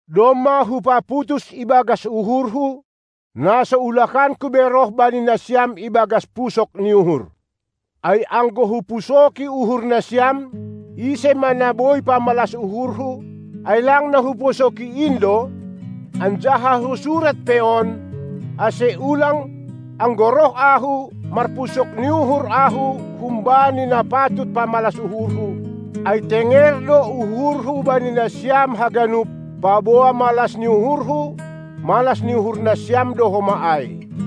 Domma hupaputus ibagas uhurhu, na so ulakanku be roh bani nasiam ibagas pusok ni uhur. Ai anggo hupusoki uhur nasiam, ise ma na boi pamalas uhurhu, ai lang na hupusoki in do? Anjaha husurat pe on, ase ulang, anggo roh ahu, marpusok ni uhur ahu humbani na patut pamalas uhurhu; ai tenger do uhurhu bani nasiam haganup, paboa malas ni uhurhu, malas ni uhur nasiam do homa ai.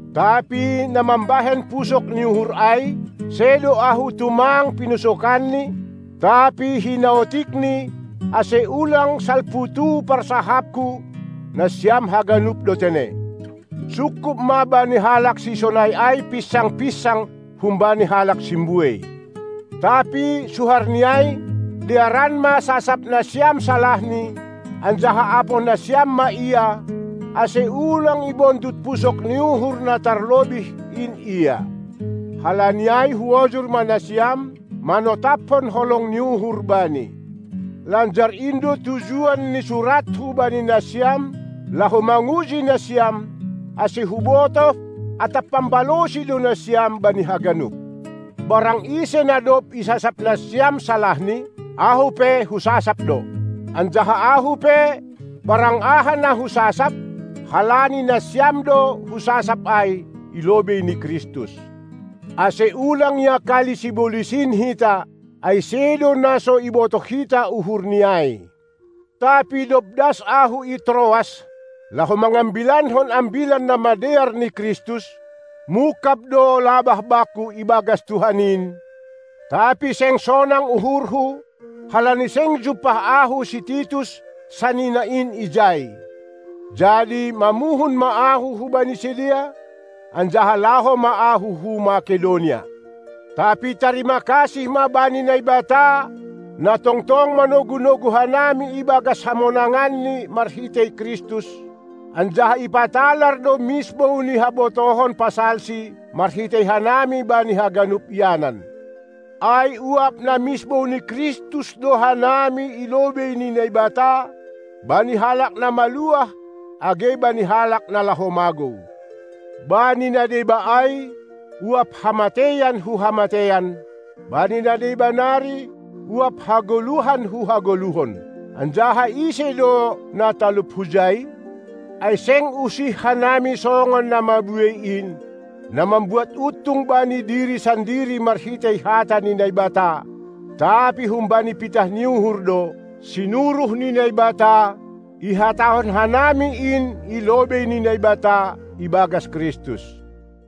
Tapi na mambahen pusok ni uhur ai, sedo ahu tumang pinusokanni, tapi hinaotikni, ase ulang salputu parsahaphu, nasiam haganup do tene. Sungkup ma bani halak sisonai ai pinsang-pinsang humbani halak simbuei. Tapi suharni ai, dearan ma sasap nasiam salahni, anjaha apoh nasiam ma ia, ase ulang ibondut pusok ni uhur na tarlobih in ia. Halani ai huojur ma nasiam, manotapkon holong ni uhur bani. Lanjar in do tujuan ni surathu bani nasiam, laho manguji nasiam, ase hubotoh atap pambalosi do nasiam bani haganup. Barang ise na dob isasap nasiam salahni, ahu pe husasap do. Anjaha ahu pe, barang aha na husasap, halani nasiam do husasap ai, i lobei ni Kristus, ase ulang iakali sibolis in hita, ai sedo na so ibotoh hita uhurni ai. Tapi dob das ahu i Troas, laho mangambilankon Ambilan Namadear ni Kristus, mungkab do labah bakku ibagas Tuhan in, tapi seng sonang uhurhu, halani seng jumpah ahu si Titus, sanina in ijai. Jadi mamuhun ma ahu hubani sidea, anjaha laho ma ahu hu Makedonia. Tapi tarima kasih ma bani Naibata, na tongtong manogu-nogu hanami ibagas hamonanganNi marhitei Kristus, anjaha ipatalar do misbou ni habotohon pasalSi marhitei hanami bani haganup ianan. Ai uap na misbou ni Kristus do hanami i lobei ni Naibata bani halak na maluah, age bani halak na laho magou, bani na deba ai uap hamateian hu hamateian, bani na deba nari uap hagoluhan hu hagoluhon. Anjaha ise do na talup hujai? Ai seng usih hanami songon na mabuei in, na mambuat untung bani diri sandiri marhitei hata ni Naibata, tapi humbani pitah ni uhur do, sinuruh ni Naibata, ihatahon hanami in i lobei ni Naibata, ibagas Kristus.